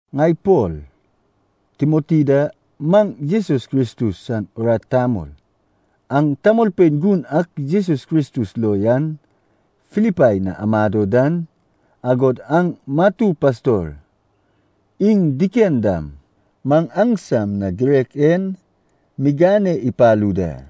Ŋai Pol, Timoti da, maŋ Jesus Kristus san urat tamol. Aŋ tamolpein gun ak Jesus Kristus lo yan Filipai na amado dan, agod aŋ matu pastor iŋ diken dam maŋ aŋsam na girek en migane ipalu da.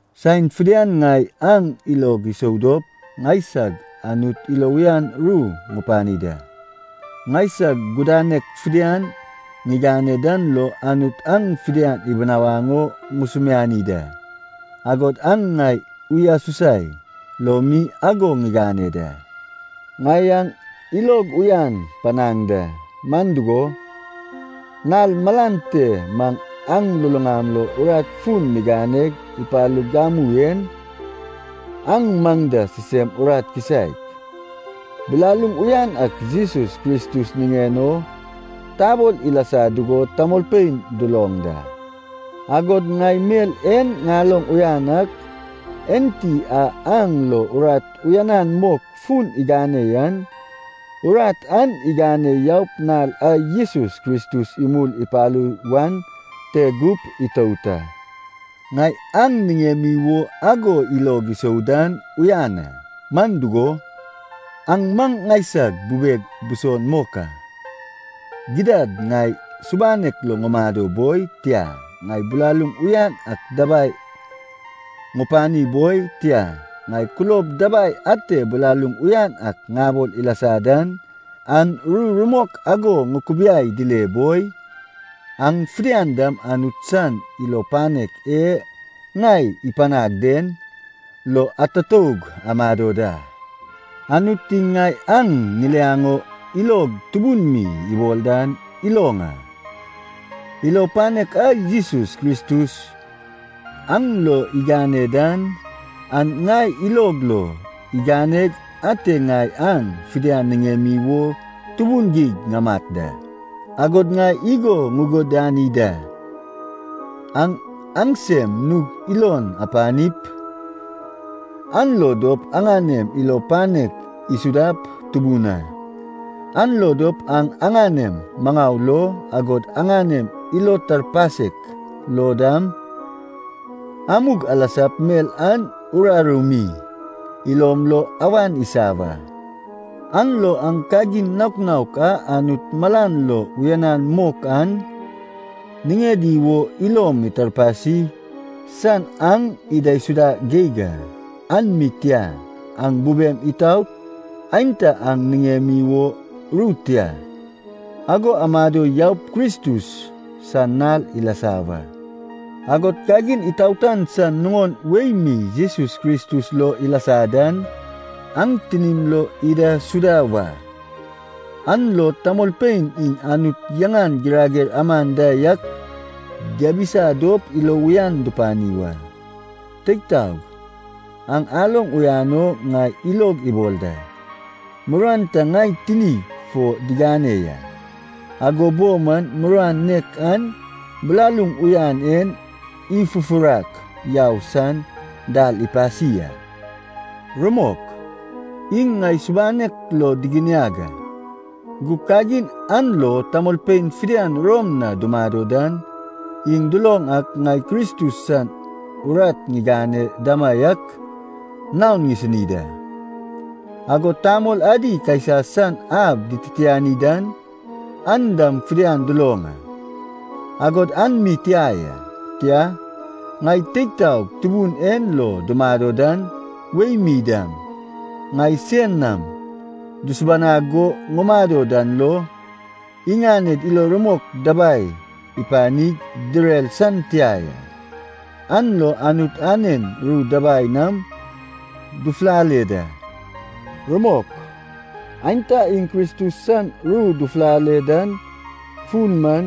Saen fidian ŋai aŋ ilog isou dop ŋaisag Anut ilo uyan ru ŋupani da. Ŋaisag gudanek fidian ŋigane dan lo Anut aŋ fidian ibinawaŋ o ŋusumiani da, agod an ŋai uyasusai lo mi ago ŋigane da. Ŋai aŋ ilog uyan panaŋ da. Man dugo, nal malan te maŋ aŋ luluŋam lo urat fun miganeg ipalug gamu en, aŋ maŋ da sisem urat kisaek, bilaluŋ uyan ak Jesus Kristus niŋen o tabol ilasa dugo tamolpein duloŋ da. Agod ŋai mel en ŋaloŋ uyan ak, Enti a aŋ lo urat uyanan mok fun igane yan, urat an igane yaup nal a Jesus Kristus imul ipalu wan te gup itout a. Ŋai aŋ niŋemi wo ago ilog isou dan uyan a. Man dugo, aŋ man ŋaisag bubeg buson mok a. Gidad ŋai subanek lo ŋumado boi, tia, ŋai bilaluŋ uyan ak dabai ŋupani boi, tia, ŋai kulob dabai ate bilaluŋ uyan ak ŋabol ilasa dan, an ru rumok ago ŋukubiai dile boi, aŋ fidian dam Anut san ilo panek e ŋai ipanag den lo atutoug amado da. Anut iŋ ŋai aŋ ŋiliaŋ o ilog tubun mi ibol dan iloŋ a. Ilo panek a Jesus Kristus aŋ lo igane dan, an ŋai ilog lo iganeg ate ŋai aŋ fidian niŋemi wo tubun geig ŋamat da. Agod ŋai igo ŋugudani da, aŋ aŋsem nug ilon apanip an lo dop aŋanem ilo panek isudap tubun a. An lo dop aŋ aŋanem maŋau lo, agod aŋanem ilo tarpasek lo dam, amug alasap mel an uraru mi ilom lo awan isa wa. An lo aŋ kagin naok naok a Anut malan lo uyanan mok an niŋedi wo ilom itarpasi san aŋ idaisuda geig a. An mi tia, aŋ bubem itaot, aenta aŋ niŋemi wo ru tia, ago amado yaup Kristus san nal ilasa wa. Agod kagin itaotan san nuŋon wei mi Jesus Kristus lo ilasa dan, aŋ tinim lo idaisuda wa. An lo tamolpein iŋ Anut yaŋan girager aman da yak diabisa dop ilo uyan dupani wa. Teig taog, aŋ aloŋ uyan o ŋai ilog ibol da, muruan ta ŋai tinig fo digane ya, ago bo man muruan nek an bilaluŋ uyan en ifufurak yau san dal ipasi a. Rumok, iŋ ŋai subanek lo diginiag a, gug kagin an lo tamolpein fidian Rom na dumado dan iŋ duloŋ ak ŋai Kristus san urat ŋigane damaiak naon ŋisini da. Agod tamol adi Kaisa san ab dititiani dan, an dam fidian duloŋ a. Agod an mi tia ya. Tia, ŋai teig taog Tubun en lo dumado dan wei mi dam, ŋai sein nam dusubanag go ŋumado dan lo, iŋaned ilo rumok dabai ipanig direr san tia ya, an lo Anut anen ru dabai nam dufulale da. Rumok, aenta iŋ Kristus san ru dufulale dan fun man,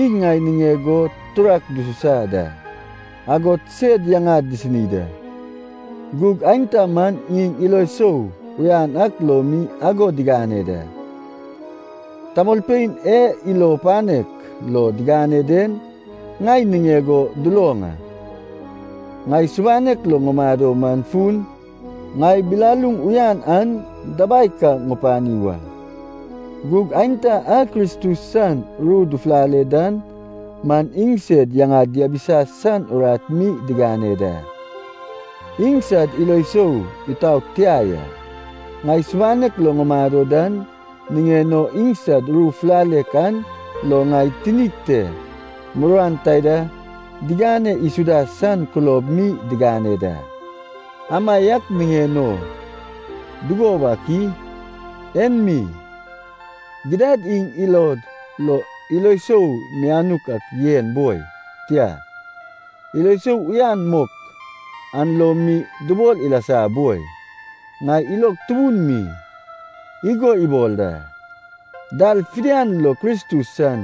iŋ ŋai niŋeg o turak dususa da, agod sed yaŋad disini da. Gug aenta man iŋ ilo sou uyan ak lo mi ago digane da. Tamolpein e ilo panek lo digane den ŋai niŋeg o duloŋ a, ŋai subanek lo ŋumado man fun, ŋai bilaluŋ uyan an dabai ka ŋupani wa. Gug aenta a Kristus san ru dufulale dan man iŋsed yaŋad diabisa san urat mi digane da. Iŋsad ilo sou itaot tia ya. Ŋai subanek lo ŋumado dan niŋen o iŋsad ru fulalek an lo ŋai tinig te muruan taida digane isuda san kulob mi digane da. Amaiak niŋen o dugo wak i? En mi, gidad iŋ ilod lo ilo sou mianuk ak yen boi, tia, ilo sou uyan mok an lo mi dubol ilasa boi, ŋai ilog tubun mi igo ibol da, dal fidian lo Kristus san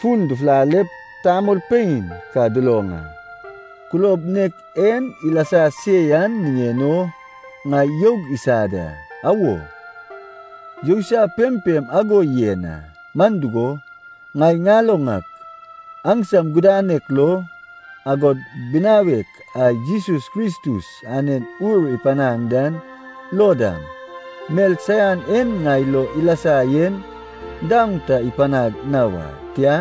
fun dufulalep tamolpein ka duloŋ a. Kulob nek en ilasa se yan niŋen o ŋai youg isa da. Awo, yousai pempem ago yen a. Man dugo, ŋai ŋaloŋ ak, aŋsam gudanek lo, agod binawek a Jesus Kristus anen Ur ipanag dan lo dam, mel saian en ŋai lo ilasa yen daoŋ ta ipanag na wa, tia,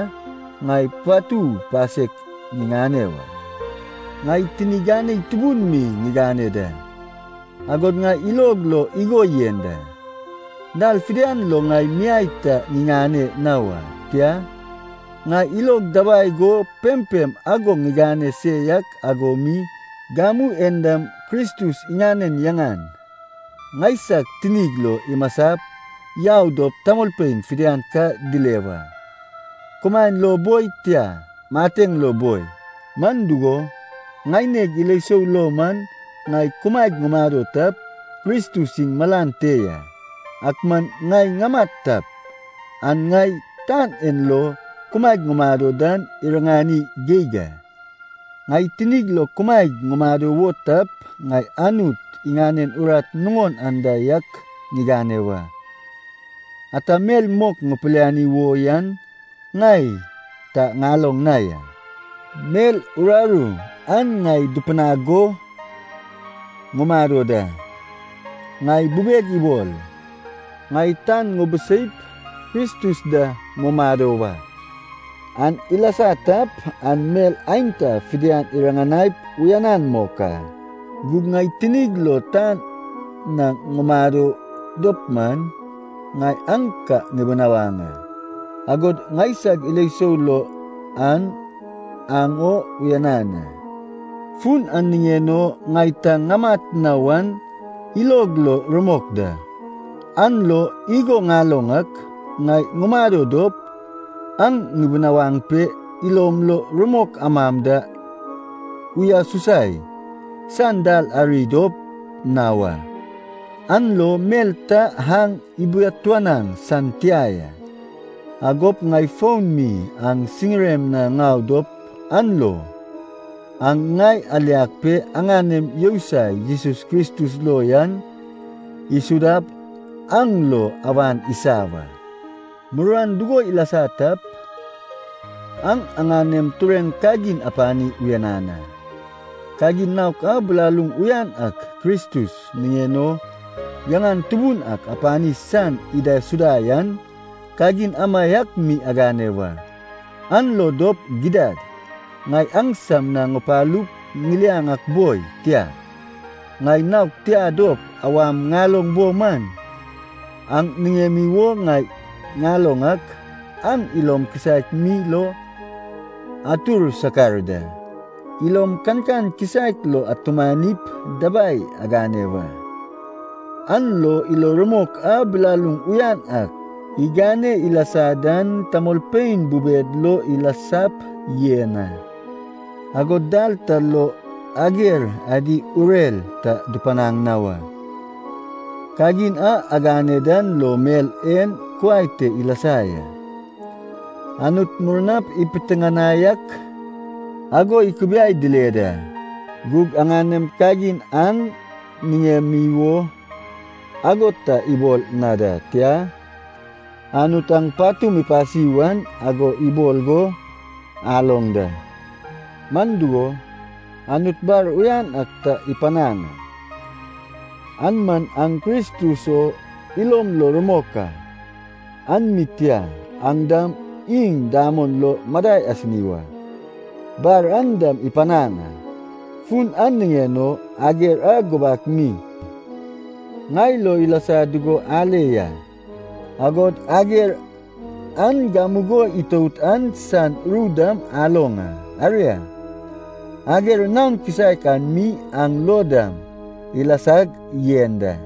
ŋai patu pasek ŋiŋane wa. Ŋai tini ganei tubun mi ŋigane da, agod ŋai ilog lo igo yen da, dal fidian lo ŋai miai ta ŋiŋane na wa. Tia, ŋai ilog dabai go pempem ago ŋigane se yak ago mi, gamu en dam Kristus iŋanen yaŋan ŋaisag tinig lo imasap yau dop tamolpein fidian ka dile wa, kumaen lo boi, tia, mateŋ lo boi. Man dugo, ŋaineg ilo sou lo man, ŋai kumaeg ŋumado tap, Kristus iŋ malan te ya, ak man ŋai ŋamat tap, an ŋai tan en lo kumaeg ŋumado dan iriŋani geig a. Ŋai tinig lo kumaeg ŋumado wo tap, ŋai Anut iŋanen urat nuŋon anda yak ŋigane wa. Ata mel mok ŋupiliani wo yan ŋai ta ŋaloŋ na ya. Mel uraru an ŋai dupinag go ŋumado da. Ŋai bubeg ibol, ŋai tan ŋubiseip Kristus da mumado wa. An ilasa tap, an mel aenta fidian iriŋanaip uyanan mok a. Gug ŋai tinig lo tan na ŋumado dop man, ŋai aŋ ka ŋubinawaŋ a, agod ŋaisag ilo sou lo an aŋ o uyanan a. Fun an niŋen o ŋai ta ŋamat na wan ilog lo rumok da. An lo igo ŋaloŋ ak, ŋai ŋumado dop, aŋ ŋubinawaŋ pe, ilom lo rumok amam da uyasusai san dal ari dop na wa, an lo mel ta aŋ ibiatuanaŋ san tia ya. Agop ŋai fon mi aŋ siŋirem na ŋau dop an lo, aŋ ŋai aliag pe aŋanem yousai Jesus Kristus lo yan isudap aŋ lo awan isa wa. Muruan dugo ilasa tap, aŋ aŋanem tureŋ kagin apani uyanan a, kagin naok a bilaluŋ uyan ak Kristus niŋen o yaŋan tubun ak ipani san idaisuda yan, kagin amaiak mi agane wa. An lo dop gidad, ŋai aŋsam na ŋupalup ŋiliaŋ ak boi, tia, ŋai naog tia dop awam ŋaloŋ bo man, aŋ niŋemi wo ŋai ŋaloŋ ak, aŋ ilom kisaek mi lo atur sakar da. Ilom kankan kisaek lo atumanip dabai agane wa, an lo ilo rumok a bilaluŋ uyan ak igane ilasa dan tamolpein bubed lo ilasap yen a. Agod dal ta lo ager adi urer ta dupanaŋ na wa. Kagin a agane dan lo mel en kuai te ilasa ya: Anut murnap ipitiŋinai ak ago ikubiai dile da, gug aŋaŋem kagin aŋ niŋemi wo ago ta ibol na da, tia, Anut aŋ patum ipasi wan ago ibol go aloŋ da. Man dugo, Anut bar uyan ak ta ipanaŋ a. An man aŋ Kristus o ilom lo rumok a. An mi tia, aŋ dam iŋ damon lo madai asini wa, bar an dam ipanaŋ a. Fun an niŋen o, ager a gubak mi ŋai lo ilasa dugo ale ya, agod ager an gamugo itout an san ru dam aloŋ a, aria, ager naon kisaek an mi aŋ lo dam ilasag yen da.